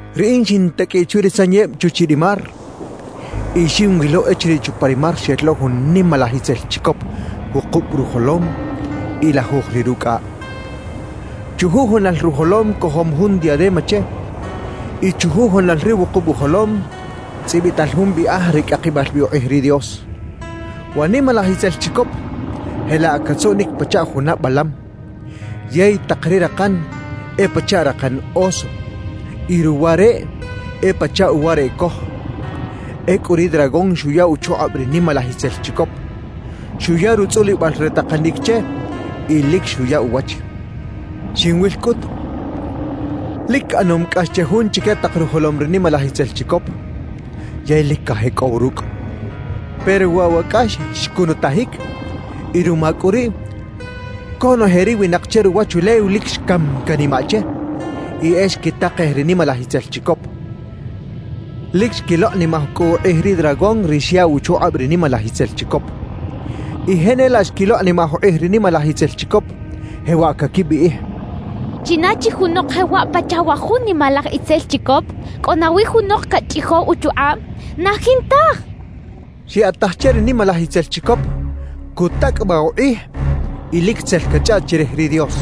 Riꞌin xintaqꞌuiꞌ chwi ri sanyeb chuchiꞌ ri mar y xinwilo echiriꞌ chupa ri mar xel lo jun nimalaj itzel chicop wukub rujolom y lajuj ri rucꞌaꞌ. Chujujunal rujolom cojom jun diadema che y chujujunal ri wukub ujolom tzꞌibital jun biꞌaj re cꞌakibal bi ukꞌij ri Dios. Wa nimalaj itzel chicop jelaꞌ catzuꞌnic pachaꞌ juna balam, yey tak ri rakan e pachaꞌ rakan oso y ruwa reꞌ e pachaꞌ uwa reꞌ coj. Ecꞌu ri dragón xuya uchukꞌab ri nimalaj itzel chicop, xuya rutzꞌulibal re takanic che y lic xuya uwach. Xinwil cꞌut, lic ꞌanom cꞌax che jun chique tak rujolom ri nimalaj itzel chicop, yey lic cajecꞌow rucꞌ. Pero waꞌ wa cꞌax xcunutajic y ruma cꞌu riꞌ conoje ri winak che ruwachulew lic xcam canimaꞌ che y e xquitakej ri nimalaj itzel chicop. Lic xquilokꞌnimaj cꞌu ukꞌij ri dragón ri xyaꞌw uchukꞌab ri nimalaj itzel chicop. Y jenelaꞌ xquilokꞌnimaj ukꞌij ri nimalaj itzel chicop, jewaꞌ caquibiꞌij: «¿China chi junok jewaꞌ pachaꞌ wa jun nimalaj itzel chicop? ¿Cꞌo nawi junok cachꞌijow uchukꞌab? ¡Na jintaj!» quechaꞌ. Xyaꞌtaj che ri nimalaj itzel chicop cutacꞌabaꞌ ukꞌij y lic tzel cachꞌaꞌt chirij ri Dios.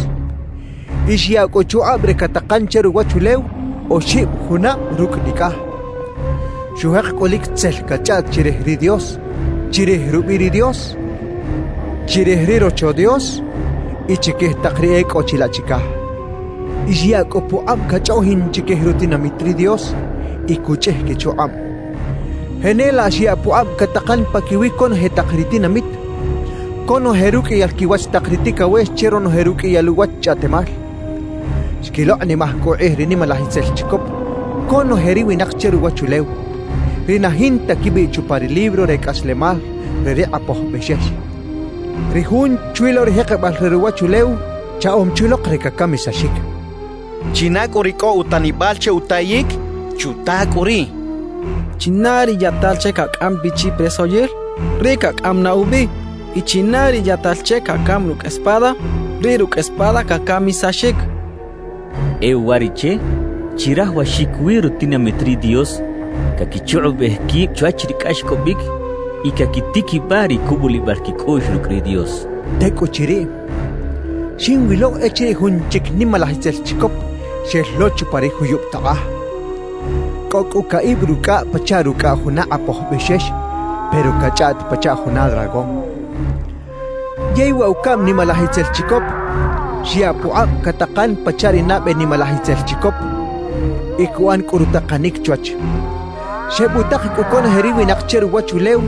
Y xyaꞌ cꞌu uchukꞌab re catakan che ruwachulew oxib junab rucꞌ nicꞌaj. Xujek cꞌu lic tzel cachꞌaꞌt chirij ri Dios, chirij rubiꞌ ri Dios, chirij ri Rocho Dios y chiquij tak ri e cꞌo chilaꞌ chicaj. Y xyaꞌ cꞌu pukꞌab cachꞌoꞌjin chiquij rutinamit ri Dios y cuchꞌij quichukꞌab. Jenelaꞌ xyaꞌ pukꞌab catakan paquiwi conoje tak ri tinamit, conoje ruqꞌuiyal quiwach tak ri ticawex che ronoje ruqꞌuiyal uwach chꞌaꞌtemal. Xquilokꞌnimaj cꞌu ukꞌij ri nimalaj itzel chicop conoje ri winak che ruwachulew, ri na jinta quibiꞌ chupa ri libro re cꞌaslemal re ri Kꞌapoj Bexex, ri Jun chwi lo ri jekebal re ruwachulew chaꞌom chi lok re cacamisaxic. China cꞌu ri cꞌo utanibal che utayic, ¡chuta cꞌu riꞌ! China ri yaꞌtal che cacꞌam bi chi presoyil, riꞌ cacꞌam na ubi; y china ri yaꞌtal che cacam rucꞌ espada, riꞌ rucꞌ espada cacamisaxic. E uwariꞌche chirajawaxic wi rutinamit ri Dios caquichukꞌubej quib chwach ri cꞌaxcꞌobic y caquitiquibaꞌ ri cubulibal quicꞌuꞌx rucꞌ ri Dios. Tecꞌuchiriꞌ, xinwilo echiriꞌ jun chic nimalaj itzel chicop xel lo chupa ri juyub takꞌaj, cꞌo cꞌu caꞌib rucꞌaꞌ pachaꞌ rucꞌaꞌ juna kꞌapoj bexex pero cachꞌaꞌt pachaꞌ juna dragón. Yey wa ucaꞌm nimalaj itzel chicop xyaꞌ pukꞌab catakan pachaꞌ ri nabe nimalaj itzel chicop y cuꞌan cꞌu rutakanic chwach. Xebutak cꞌu conoje ri winak che ruwachulew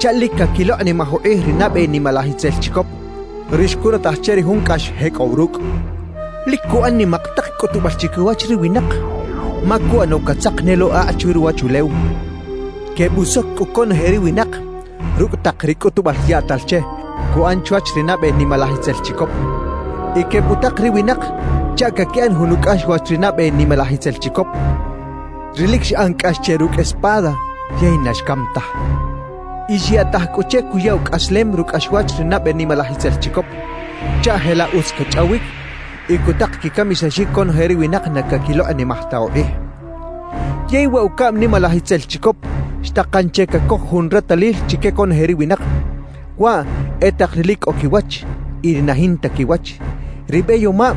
chaꞌ lic caquilokꞌnimaj ukꞌij ri nabe nimalaj itzel chicop, ri xcunutaj che ri jun cꞌax xjecꞌow rucꞌ. Lic cuꞌan nimak tak cꞌutubal chiquiwach ri winak, ma cuꞌano catzak ne lo akꞌ chwi ruwachulew. Quebusoc cꞌu conoje ri winak rucꞌ tak ri cꞌutubal yaꞌtal che cuꞌan chwach ri nabe nimalaj itzel chicop. Y quebutak ri winak chaꞌ caquiꞌan jun ucꞌaxwach ri nabe nimalaj itzel chicop, ri lic xꞌan cꞌax che rucꞌ espada yey na xcam taj. Y xyaꞌtaj cꞌu che cuya ucꞌaslem rucꞌaxwach ri nabe nimalaj itzel chicop, chaꞌ jelaꞌ utz cachꞌawic y cutak quicamisaxic conoje ri winak na caquilokꞌnimaj ta ukꞌij. Yey wa ucaꞌm nimalaj itzel chicop xtakan che cacoj jun retalil chique conoje ri winak, waꞌ e tak ri lic cꞌo quiwach y ri na jinta quiwach, ri beyomab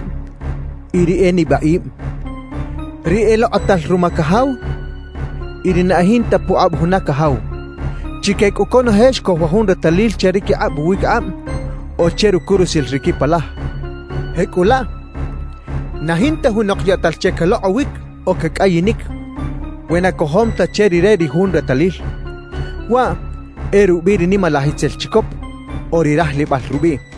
y ri e nibaꞌib, ri elokꞌotal ruma cajaw y ri na e jinta pukꞌab juna cajaw; chique cꞌu conoje xcoj wa jun retalil che ri quikꞌab uwiquikꞌab o che rucurusil ri quipalaj. Jecꞌulaꞌ, na jinta junok yaꞌtal che calokꞌowic o cacꞌayinic we na cojom ta che rire ri jun retalil, waꞌ e rubiꞌ ri nimalaj itzel chicop o ri rajlibal rubiꞌ.